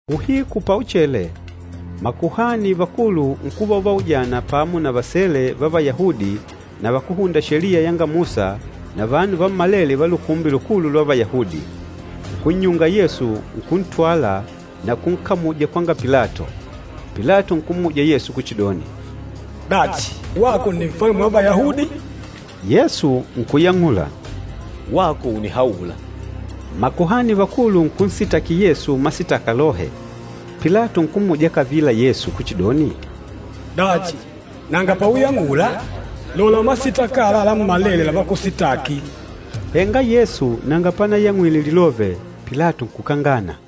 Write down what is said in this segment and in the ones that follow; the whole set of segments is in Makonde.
Uhiku pauchele, makuhani vakulu nkuva uvaujana pamo na vasele va Vayahudi na vakúhunda Sheliya yanga Musa na vanu vammalele va Lukumbi Lukulu lwa Vayahudi. Nkunnyunga Yesu, nkuntwala na kunkamuja kwanga Pilato. Pilato nkummuja Yesu kuchidoni, “Dachi, wako nni Nfalume wa Vayahudi?” Yesu nkuyang'ula, “Wako ùnihaula.” Makuhani vakulu nkunsitaki Yesu masitaka lohe. Pilato nkummuja kavila Yesu kuchidoni, “Dachi, nanga pauyang'ula? Lola masitaka ala lammalele lavakusitaki!” Henga Yesu nanga panayang'wile lilove, Pilato nkukangana.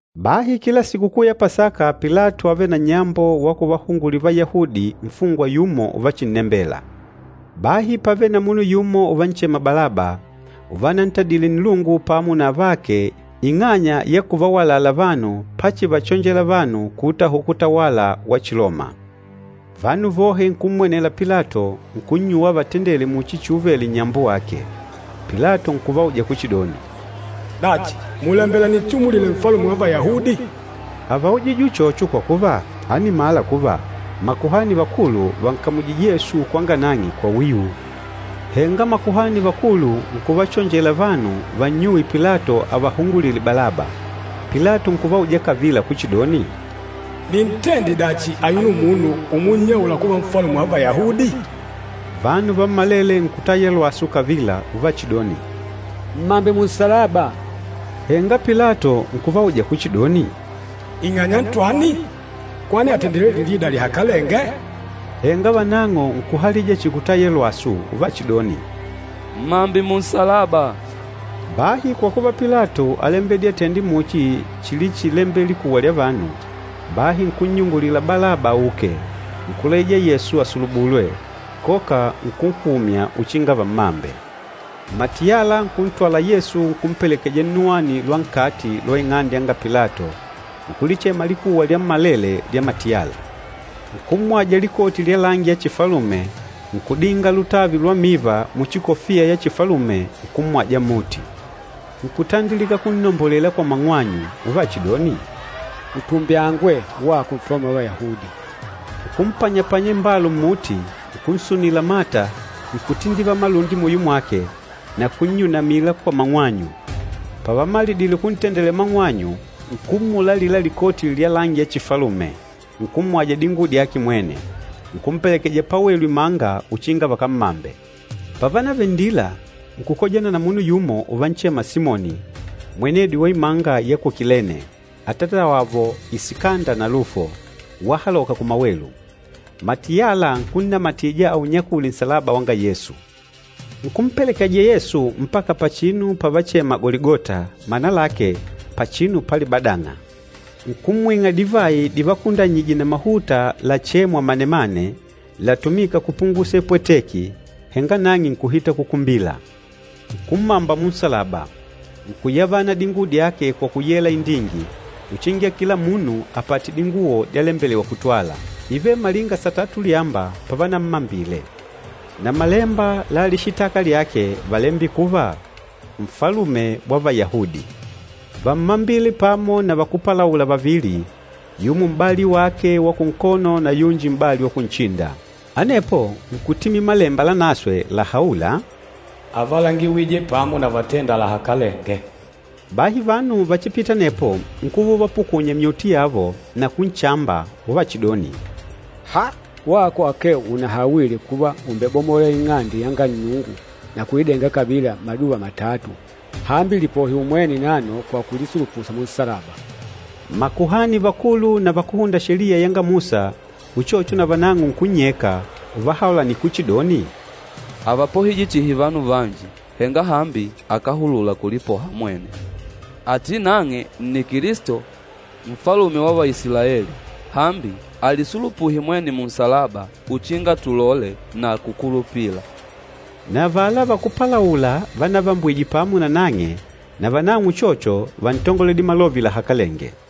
Bahi kila Sikukuu ya Pasaka Pilato ávele na nnyambo wa kuvahungulila Vayahudi nfungwa yumo uvachinnembela. Bahi pávele na munu yumo uvanchema Balaba, uvanantadile nnilungu pamo na avake ing'anya ya kuvawalala vanu pachivachonjela vanu kuutahuka utawala wa Chiloma. Vanu vohe nkummwenela Pilato nkunnyuwa avatendele muchi chiuvele nnyambo wake. Pilato nkuvauja kuchidoni, “Dachi, mùlembela ninchimulile Nfalume wa Vayahudi?” Avaujije uchocho kwa kuva, ánimala kuva makuhani vakulu vànkamujije Yesu kwanga nang'e kwa wiu. Henga makuhani vakulu nkuvachonjela vanu vannyuwe Pilato avahungulile Balaba. Pilato nkuvauja kavila kuchidoni, “Nintende dachi ayuno munu umunnyaula kuva Nfalume wa Vayahudi?” Vanu vammalele nkutaya lwasu kavila uvachidoni, “Mmambe munsalaba!” Henga Pilato nkuvauja kuchidoni, “Ing'anya ntwani? Kwani àtendile lilida lihakalenge?” Henga vanang'o nkuhalija chihi kutaya lwasu uvachidoni, “Mmambe munsalaba!” Bahi kwa kuva Pilato álembedile atende muchi chilichilembela likuwa lya vanu, bahi nkunnyungulila Balaba auke. Nkulaija Yesu asulubulwe, koka nkunhumya uchinga vammambe. Matiyala nkuntwala Yesu nkumpelekeja nnuwani lwa nkati lwa ing'ande yanga Pilato, nkulichema likuwa lyammalele lya matiyala. Nkummwaja likoti lya langi ya chifalume, nkudinga lutavi lwa miva muchi kofiya ya chifalume nkummwaja mmuti. Nkutandilika kunnombolela kwa mang'wanyu uvachidoni, “Utumbyangwe wako Nfalume wa Vayahudi!” Nkumpanyapanya imbalu mmuti, nkunsunila mata, nkutindivala malundi muyo mwake, na kunnyunamila kwa mang'wanyu. Pavamalidile kuntendela mang'wanyu, nkummula alila likoti lya langi ya chifalume, nkummwaja dinguwo dyake mwene, nkumpelekeja pawelu imanga uchinga vakammambe. Pávanavele nndila, nkukojana na munu yumo uvanchema Simoni, mwenedi wa imanga ya ku Kilene, atatawavo Isikanda na Lufo, wahaloka kumawelu. Matiyala nkunnamatija aunyakule nsalaba wanga Yesu. Nkumpelekeja Yesu mpaka pachinu pavachema Goligota, mana lake, “Pachinu pa Libadang'a.” Nkumwing'a divayi divakundanyije na mahuta lachêmwa manemane, latumîka kupungusa ipwateki, henga nang'e nkuhita kukumbila. Nkummamba munsalaba, nkuyavana dinguwo dyake kwa kuyela indingi, uchinga kila munu apate dinguwo dyalembelewa kutwala. Ívele malinga satatu ulyamba pavanammambile. Na malemba la lishitaka lyake válembile kuva, “NFALUME WA VAYAHUDI.” Vámmambile pamo na vakúpalaula vavili, yumo m'bali wake wa kunkono na yumo m'bali wa kunchinda. [ Anepo nkutimila Malemba Lanaswe lahaûla, “Ávalangiwije pamo na vatênda lahakalenge.”] Bahi vanu vachipîta anepo nkuva uvapukunya myuti yavo na kunchamba, uvachidoni, “Haa! Wako akee unahawile kuva ùmbebamola Ing'ande yanga Nnungu na kuidenga kavila mmaduva matatu! Hambi lipohe umwene nano kwa kulisulupuha munsalaba!” Makuhani vakulu na vakúhunda Sheliya yanga Musa uchocho na vanang'o nkunnyeka uvahaulanila kuchidoni, “Ávapohije chihi vanu vanji, henga hambi akáhulula kulipoha mwene! Ati nang'e nni Kilisto, Nfalume wa Vaisilaeli! Hambi alisulupuhe mwene munsalaba uchinga tulole na kukulupila.” Na avala vakúpalaula vanavambwije pamo na nang'e navanang'o uchocho vántangoledile malove lahakalenge.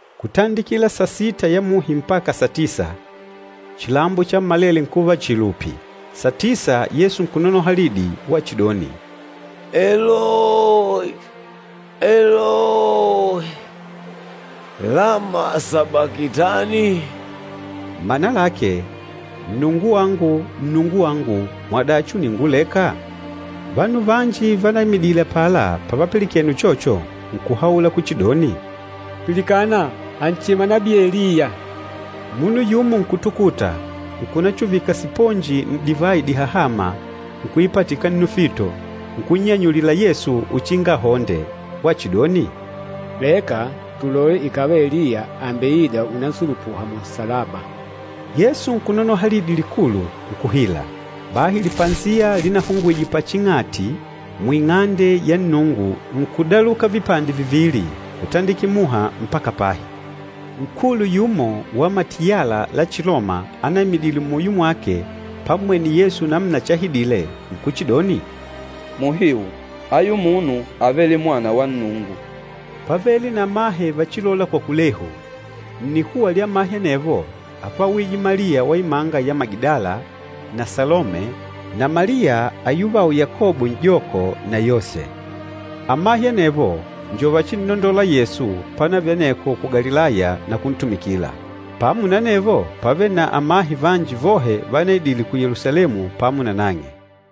Kutandikila sasita ya muhi mpaka satisa, chilambo chammalele nkuva chihi lupi. Satisa Yesu nkunonoha lidi, wachidoni, “Eloyi, Eloyi, lama sabakitani?” Mana lake, “Nnungu wangu, Nnungu wangu, mwadachi ùninguleka?” Vanu vanji vanaimidile apala pavapilikene uchocho, nkuhaula kuchidoni, “Pilikana! Ànchema nabii Eliya.” Munu yumo nkutukuta, nkunachuvika siponji n'divayi dihahâma nkuipatika nnufito, nkunnyanyulila Yesu uchinga ahonde, wachidoni, “Leka, tulole ikàva Eliya àmbeida unansulupuha munsalaba!” Yesu nkunonoha lidi likulu, nkuhila. Bahi lipasiya linahungwije paching'ati, mu Ing'ande ya Nnungu nkudaluka vipande vivili kutandikila muha mpaka pahi. Nkulu yumo wa matiyala la Chiloma anaimidile muyo mwake pammwene Yesu namuna chahidile, nkuchidoni, “Muhiu ayu munu ávele Mwana wa Nnungu.” Pávele na amahe vachilôla kwa kulehu. Nnikuwa lya amahe anevo ápwawije Maliya wa imanga ya Magidala na Salome na Maliya ayuvao Yakobo n'joko na Yose. Amahe anevo njo vachinnondola Yesu pánavele aneko ku Galilaya na kuntumikila. Pamo na anevo, pávele na amahe vanji vohe vanaidile ku Yelusalemu pamo na nang'e.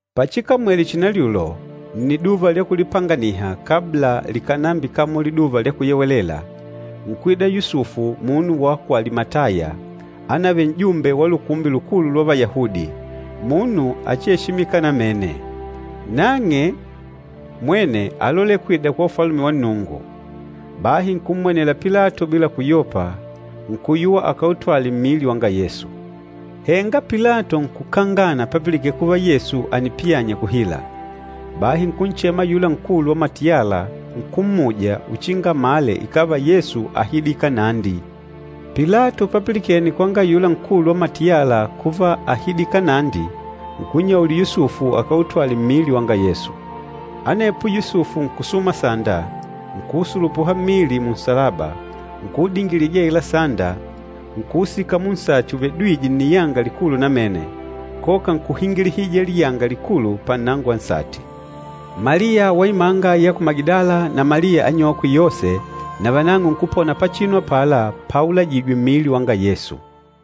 Pachikamwele chinalyulo, nniduva lya kulipanganiha kabla likànambikamola Liduva lya Kuyewelela, nkwida Yusufu munu wa ku Alimataya, ánavele n'jumbe wa Lukumbi Lukulu lwa Vayahudi, munu achieshimika namene. Nang'e mwene álolela kwida kwa Ufalume wa Nnungu. Bahi nkummwenela Pilato bila kuyopa, nkuyuwa akautwale mmili wanga Yesu. Henga Pilato nkukangana papilikene kuva Yesu ànipiyanya kuhila. Bahi nkunchema ayula nkulu wa matiyala, nkummuja, uchinga amale ikàva Yesu áhidile kanandi. Pilato papilikene kwanga ayula nkulu wa matiyala kuva áhidile kanandi, nkunnyaulila Yusufu akautwale mmili wanga Yesu. Anepo Yusufu nkusuma sanda, nkuusulupuha mmili munsalaba, nkuudingilija aila sanda, nkuusika munsati uvedwîje nniyanga likulu namene, koka nkuhingilihija liyanga likulu pannango wa nsati. Maliya wa imanga ya ku Magidala na Maliya anyokwe Yose navanang'o nkupona pachinu apala paulajijwe mmili wanga Yesu.